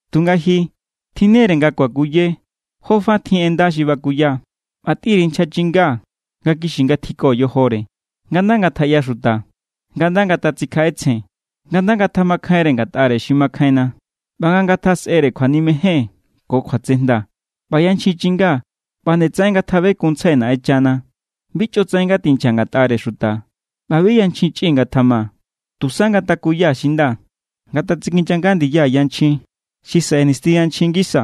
Tunga ji, tjinne=re nga kuakuye jofa tjin en nda xi bakuya. ꞌBa tꞌin_ri nchja chinga nga kixi= ngatjiko yojore, nga nda ngatjaꞌyaxuta, nga nda ngatatsikjaꞌetsjen, nga nda ngatjamakjainre ngatꞌare xi makjainna, ꞌba nga ngatjasꞌere kjuanimejen ko kjuatsejnda. ꞌBa yanchjin chinga ꞌba nde tsaꞌen ngatjabekunntsjai Naꞌenchana. Bi chꞌotsaꞌen ngatinchja ngatꞌare xuta ꞌba bi yanchjin chꞌi ngatjama. Tusa ngatakuya xi nda, ngatatsikinyanga ndiya yanchjin xi saꞌe nisti yanchjin ngisa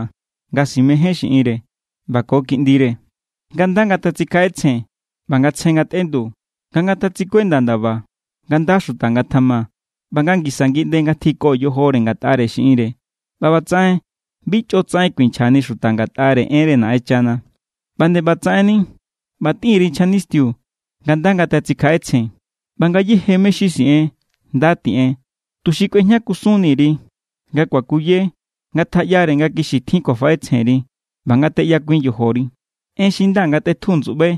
nga simején xiꞌinre ꞌba ko kiꞌndire, nga nda ngatatsikjaꞌetsjen ꞌba nga tsje ngatꞌendu, nga ngatatsikuenda ndaba, nga nda xuta ngatjama, ꞌba nga ngisa ngiꞌnde ngatjiko yojore ngatꞌare xiꞌinre. ꞌBa ꞌbatsaꞌen bi chꞌotsaꞌen kuinchjani xuta ngatꞌare enre Naꞌenchana. ꞌBa nde ꞌbatsaꞌenni, ꞌba tꞌin_ri nchja nistiu nga nda ngatatsikjaꞌetsjen. ꞌBa ngayéje mé= xi siꞌen, nda tiꞌen, tuxi kꞌuejña kusunni_ri. Nga kuakuye, ngatjaꞌyare nga kixi tjin kjuafaꞌetsjenri ꞌba nga teꞌyakuin yojori. En xi nda ngatꞌetju ndsuꞌbai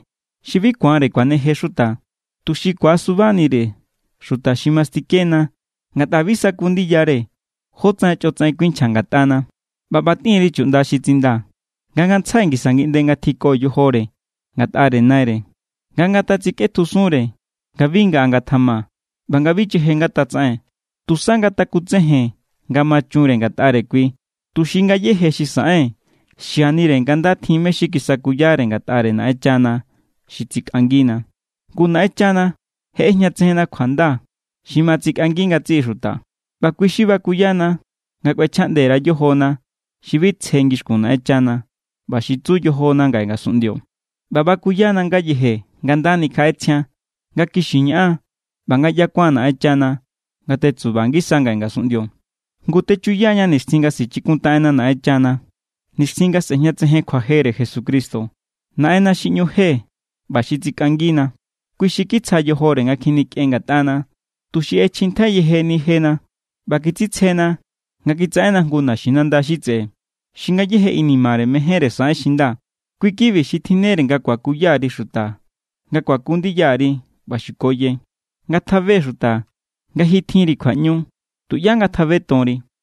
xi bi ku̱anre kuaneje xuta, tuxi ku̱asubanire xuta xi mastikena ngatꞌa bi saku ndiyare jótsaꞌen chꞌotsaꞌen kuinchja ngatꞌana. ꞌBa ꞌba tꞌin_ri chuꞌnda xi tsindaa̱ nga ngantsjai ngisa ngiꞌnde ngatjiko yojore ngatꞌare naire, nga ngatatsikꞌetjusunre, nga bi ngaꞌa ngatjama ꞌba nga bi cheje ngatatsaꞌen. Tusa ngatakutsejen nga ma chunre ngatꞌare kui, tuxi ngayéje xi saꞌen xianire nga nda tjin mé= xi kisakuyare ngatꞌare Naꞌenchana xi tsikꞌangina. Ngu Naꞌenchana je ꞌejñatsejen kjuanda xi ma tsikꞌangi ngatsiꞌi xuta. ꞌBa kui xi bakuyana nga kꞌuechjaꞌnde_ra yojona xi bi tsje ngixkun Naꞌenchana ꞌba xi tsu yojona ngaꞌe ngasunꞌndio. ꞌBa bakuyana ngayeje nga nda nikjaꞌetsjian, nga kixi ñaꞌan, ꞌba nga ꞌyakuan Naꞌenchana nga tetsuba ngisa ngaꞌe ngasunꞌndio. Ngu techuyaña nixtjin nga sichikuntaꞌenna Naꞌenchana, nixtjin nga sꞌe̱jñatsejen kjuajere Jesucristo, Naꞌenna xi ꞌñu je ꞌba xi tsikꞌangina. Kui xi kitsja yojore nga kjinikꞌen ngatꞌana, tuxi ꞌechjintjai yejeni jena ꞌba kitsitsjena nga kitsaꞌenna jngu naxinanda xi tseꞌe, xi ngayéje inimare mejénre saꞌen xi nda. Kui= kibi xi tjinnere nga kuakuya_ri xuta nga kuaku ndiya_ri ꞌba xukoye. Ngatjabe xuta nga ji tjinri kjuaꞌñu. Tuꞌyá ngatjabetonri.